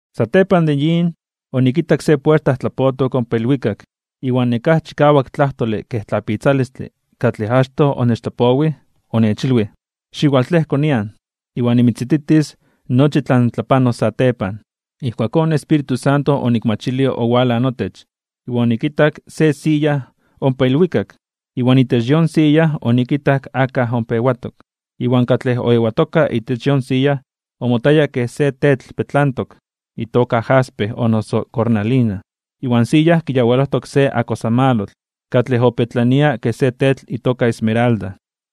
Satepan de yin, onikitak se puerta tlapotok ompa ilwikak. Iwan nekáj chikawak tlajtole kej tlapitzalistle, katlej achtoj onechtlapowij, onechilwij: ―Xiwaltlejko nian, iwan nimitzititis nochi tlan tlapanos satepan. Ijkuakón in Espíritu Santo onikmachilij owalaj notech, iwan onikitak se siya ompa ilwikak, iwan itech yon siya onikitak akaj ompa ewatok. Iwan katlej oewatoka itech yon siya omotaya kej se tetl petlantok itoka jaspe o noso cornalina. Iwan siya kiyawalojtok se akosamalotl, katlej opetlania kej se tetl itoka esmeralda.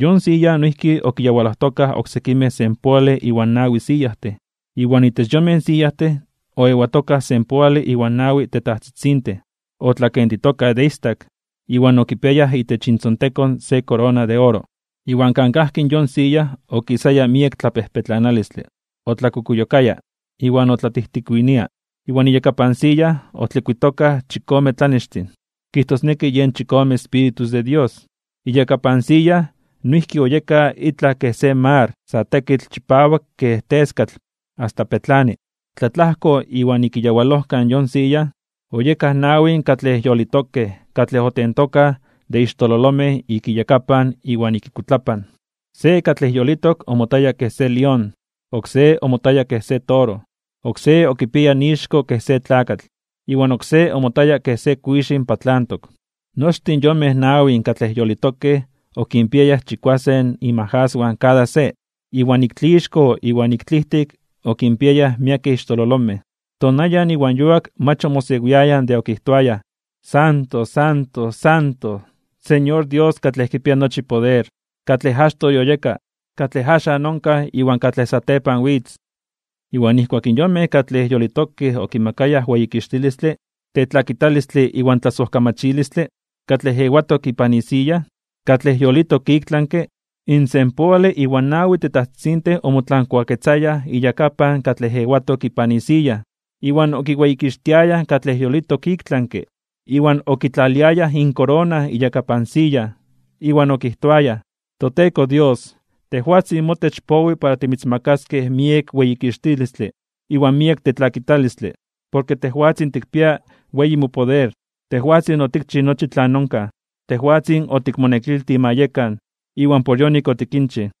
Yon siya noijki okiyawalojtokaj oksekimej senpoale iwan nawi siyajtin, iwan itech yonmej siyajtin oewatokaj senpoale iwan nawi tetajtzitzintin, otlakentitokaj de istak iwan okipiayaj itech intzontekon se korona de oro. Iwan kan kajki yon siya okisaya miek tlapejpetlanalistle, otlakukuyokaya iwan otlatijtikuinia. Iwan iyakapan siya otlikuitokaj chikome tlanextin, kijtosneki yen chikome espíritus de Dios. Iyakapan siya noijki oyeka itlaj kej se mar sa tekitl chipawak kej teskatl asta pepetlani. Tlatlajko iwan ik iyawalojkan yon siya, oyekaj nawin katlej yolitokej katlej otentokaj de ixtololomej ik inyakapan iwan ik inkuitlapan. Se katlej yolitok omotaya kej se lión, oksé omotaya kej se toro, oksé okipiaya ixko kej se tlakatl, iwan oksé omotaya kej se kuixin (águila) patlantok. Nochtin yonmej nawin katlej yolitokej okinpiayaj chikuasen inmajaswan kada se, iwan ik tlixko iwan ik tlijtik okinpiayaj miekej ixtololomej. Tonayan iwan yuak mach omosewiayaj de okijtoayaj: Santo, Santo, Santo, Señor, Dios katlej kipia nochi poder, katlej achtoj yoyeka, katlej axan onkaj iwan katlej satepan witz. Iwan nijkuak in yonmej katlej yolitokej okimakayaj weyikixtilistle, tetlakitalistle iwan tlasojkamachilistle, katlej ewatok ipan isiya, katlej yolitok iktlanke (ik tlami), in senpoale iwan nawi tetajtzitzintin omotlankuaketzayaj iyakapan katlej ewatok ipan isiya, iwan okiweyikixtiayaj katlej yolitok iktlanke, iwan okitlaliayaj inkorona iyakapan siya, iwan okijtoayaj: ToTeko Dios, tejwatzin motech powi para timitzmakaskej miek weyikixtilistle iwan miek tetlakitalistle, porke tejwatzin tikpia weyi mopoder. Tejwatzin otikchij nochi tlan onkaj, tejwatzin otikmonekiltij ma yekan, iwan por yonik otikinchij.